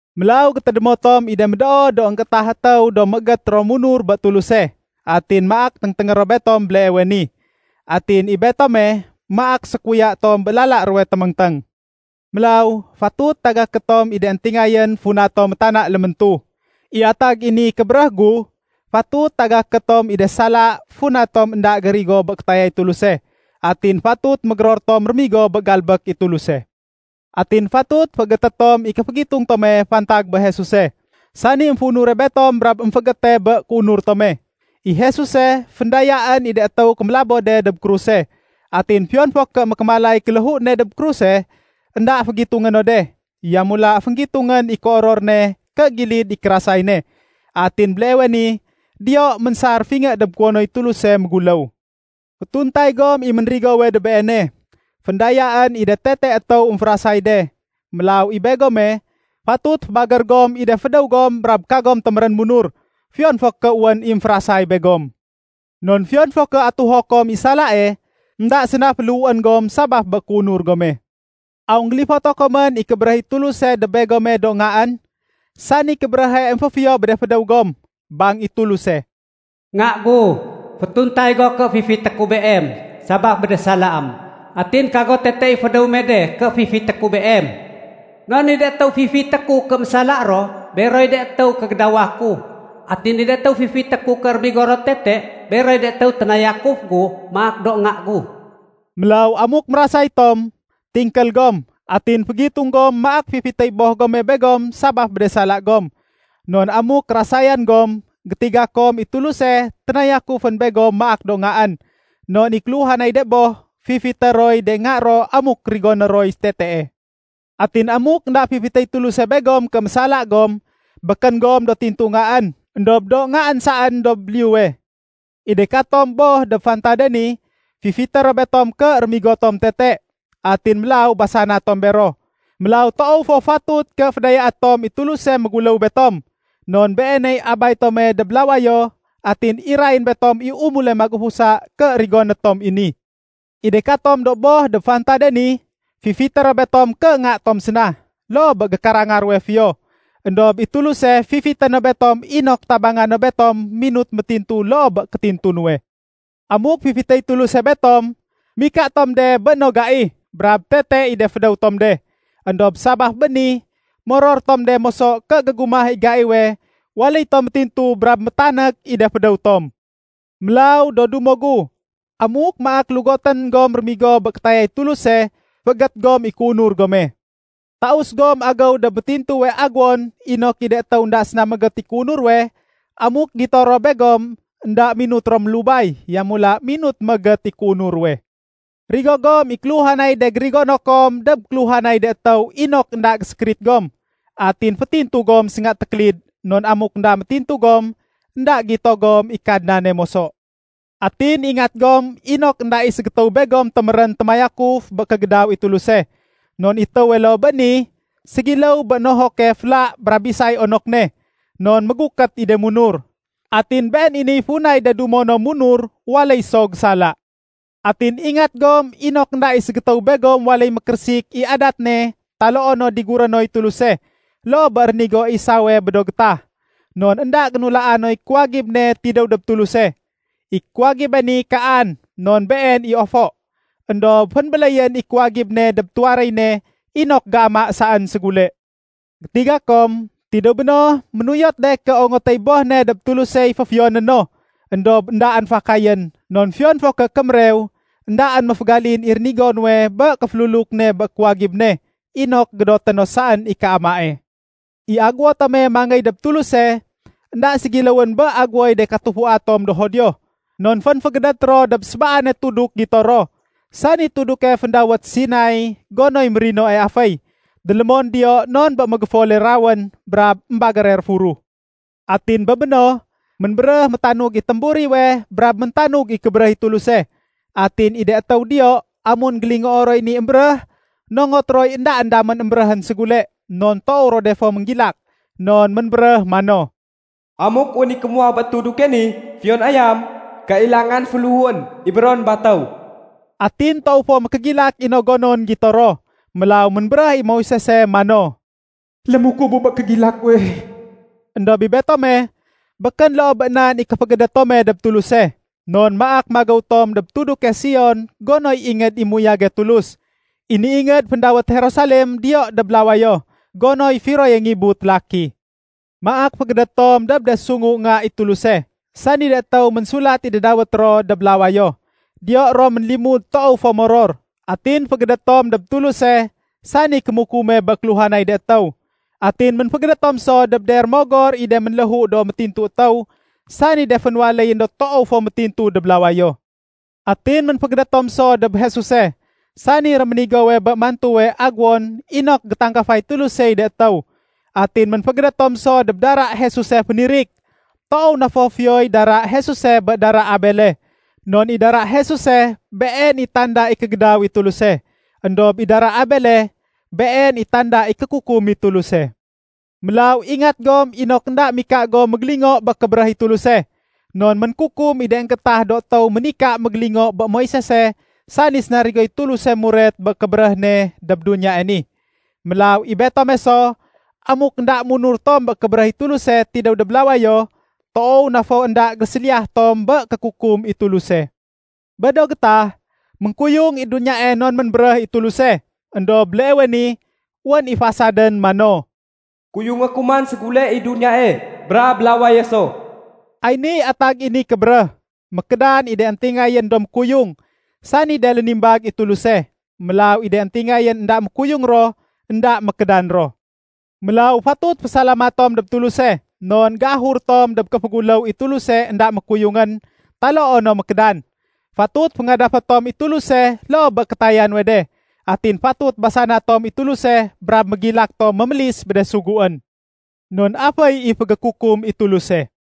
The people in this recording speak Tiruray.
Mélaw gétédémo tom i de médoo do énggéétah étéw do méégét ro munur bé Tuluse. Atin maak téngténgé ro betom béleewe ni. Atin i betome, maak sékuya tom bé lala ruwe téméngténg. Mélaw fatut tagaké tom i de éntingayén funa tom métana léméntu. I atag i ni kébéréh gu, fatut tagaké tom i de sala funa tom énda gérigo bé kétayay Tuluse. Atin fatut mégéror tom rémigo bé galbék i Tuluse. Atin fatut féégété tom i kéfégitung tome fantag bé Jesuse, sani émféunure betom brab émféégéte bé kéunur tome. I Jesuse, féndayaén i de étéw kémélabo de dob kruse. Atin fiyon fo ké mékémalay kéléhu ne dob kruse, énda fégitungé no de. Yamula fénggitungén i kéoror ne ké gilid i kérasay ne. Atin béleewe ni diyo ménsar fingé dob kuwonoy Tuluse méguléw. Fétuntay gom i ménrigowe dob Beene. Féndayaén i de tete étéw émférasay de. Mélaw i begome, fatut fébagér gom i de fédéw gom brab kagom témérén munur, fiyon fo ké wén i émférasay begom. Non fiyon fo ké atuho kom i salae, énda séna féléhuén gom sabaf bé kéunur gome. Aw énggélifoto komén i kébéréh i Tuluse dob begome do ngaén, sani kébéréhe émféfiyo bé de fédéw gom? Bang i Tuluse, “Nga gu, fétuntay go ké fifité ku beem sabaf bé de salaém. Atin kago tete i fédéw me de ké fifité ku beem. Non i de étéw fifité ku ké mésala ro, beroy de étéw kégédawa ku. Atin i de étéw fifité ku ké rémigo ro tete, beroy de étéw ténayakuf gu maak do nga gu.” Mélaw amuk mérasay tom, tingkél gom atin fégitung gom maak fifitéy boh gome begom sabaf bé de sala gom. Non amuk kérasayan gom, gétiga kom i Tuluse ténayakufén begom maak do ngaén. Non i kéluhanay de boh, fifité roy de nga ro amuk rigoné roy tetee. Atin amuk énda fifitéy Tuluse begom ké mésala gom, békén gom do tintu ngaén, éndob do ngaén saén dob liyuwe. I de katom boh dob fantade ni, fifité ro betom ké rémigo tom tete. Atin mélaw basana tom bero. Mélaw, toow fo fatut ké fédayaé tom i Tuluse méguléw betom. Non Beeney Abay tome dob lawayo atin irayén betom i umule magufusa ké rigoné tom i ni. I de katom do boh dob fantade ni, fifité ro betom ké nga tom séna, loo bé gékaranga ruwe fiyo. Endob i Tuluse fifité no betom inok tabanga no betom minut métintu loo bé kétintu nuwe. Amuk fifitéy Tuluse betom, mika tom de bé no gai brab tete i de fédéw tom de. Endob sabaf bé ni moror tom de moso ké gégumah i gaiwe waléy tom métintu brab métanék i de fédéw tom. Mélaw, do dumo gu, amuk maak lugotén gom rémigo bé kétayay Tuluse féégét gom i kéunur gome. Taus gom agéw dob métintuwe aguwon inok i de étéw énda séna méégét i kéunur ruwe, amuk gito ro begom énda minut ro mélubay, yamula minut méégét i kéunur ruwe. Rigo gom i kéluhanay de gérigono kom dob kéluhanay de étéw inok énda gésékérit gom. Atin fétintu gom sénga tékélid, non amuk énda métintu gom, énda gito gom i Kadnane moso. Atin ingat gom inok énda i ségétéw begom témérén témayakuf bé kégédaw i Tuluse. Non i étéwe loo bé ni ségiléw bé nohoke féla brab bisay onok ne, non mégukét i de munur. Atin been i niy funay de dumo no munur waléy so gésala. Atin ingat gom inok énda i ségétéw begom waléy mékérésik i adat ne taloo no diguré noy Tuluse, loo bé rénigo Esawe bé do gétah. Non énda génulaa noy kuwagib ne tidéw dob Tuluse. I kuwagibe ni kaan, non been i ofo. Endob fénbéléyén i kuwagib ne dob tuwaréy ne inok géama saén ségule. Gétiga kom, tidéw béno ménuyot de ké ongotéy boh ne dob Tulusey féfiyoné no. Endob éndaén fakayén, non fiyon fo ké kémérew, éndaén méfégalin i rénigo nuwe bé kéféluluk ne bé kuwagib ne inok gédoté no saén i kaamae. I aguwo tome mangéy dob Tuluse, énda ségiléwén bé aguwoy de katufua tom do Judio. Non fénfégédét ro dob sébaane tuduk gito ro, sani tuduke féndawét Sinai gonoy mérinoe aféy. Délémon diyo non bé mégéfole rawén brab émbagére réfuruh. Atin bé béno, ménbéréh métanug i témburiwe brab méntanug i kébéréh i Tuluse. Atin i de étéw diyo, amun énggélingoo roy ni émbéréh, nongot roy éndaén damén émbéréhén ségule, non toow ro de fo ménggilak. Non ménbéréh mano, “Amuk wén i kémuwah bé tuduke ni, fiyon ayam, kailangan féléhuén ibéron batéw.” Atin toow fo mékégilak i no gonon gito ro. Mélaw ménbéréh i Moisese mano, “Lémukubu bé kégilak guwe.” Endob i betome, békén loo bé nan i kéfégédét tome dob Tuluse. Non maak magéw tom dob tuduke Sion gonoy ingéd i méuyage Tulus. I ni ingéd féndawét Jerusalem diyo dob lawayo, gonoy firoye ngibu télaki. Maak fégédét tom dob de sungu nga i Tuluse, sani de étéw ménsulat i de dawét ro dob lawayo. Diyo ro ménlimud toow fo moror. Atin fégédét tom dob Tuluse, sani kémukume bé kéluhanay de étéw. Atin ménfégédét tom so dob de rémogor i de ménléhu do métintu étéw, sani de fénwaléyén do toow fo métintu dob lawayo. Atin ménfégédét tom so dob Jesuse, sani réménigowe bé mantuwe aguwon inok gétanggafay Tulusey de étéw. Atin ménfégédét tom so dob dara Jesuse fénirik. Toow na fo fiyoy dara Jesuse bé dara Abele. Non i dara Jesuse been i tanda i kégédaw i Tuluse. Endob i dara Abele, been i tanda i kékukum i Tuluse. Mélaw ingat gom inok énda mika gom mégélingo bé kébéréh i Tuluse. Non ménkukum i de énggéétah do étéw ménika mégélingo bé Moisese sani sénarigoy Tuluse muret bé kébéréh ne dob duniyae ni. Mélaw i betome so, amuk énda munur tom bé kébéréh i Tuluse tidéw dob lawayo, toow na fo énda géséliyah tom bé kékukum i Tuluse. Bé do gétah, ménkuyung i duniyae non ménbéréh i Tuluse. Endob béleewe ni, wén i fasadén mano, “Kuyungé ku man ségule i duniyae brab lawaye so.” Ay niy atag i ni kébéréh: Mékédan i de éntingayén do mékuyung, sani de lénimbag i Tuluse. Mélaw i de éntingayén énda mékuyung ro énda mékédan ro. Mélaw fatut fésalamat tom dob Tuluse, non géahur tom dob kéféguléw i Tuluse énda mékuyungén taloo no mékédan. Fatut féngadafé tom i Tuluse loo bé kétaya nuwe de. Atin fatut basana tom i Tuluse brab mégilak tom mémélis bé de suguén. Non aféy i fégékukum i Tuluse.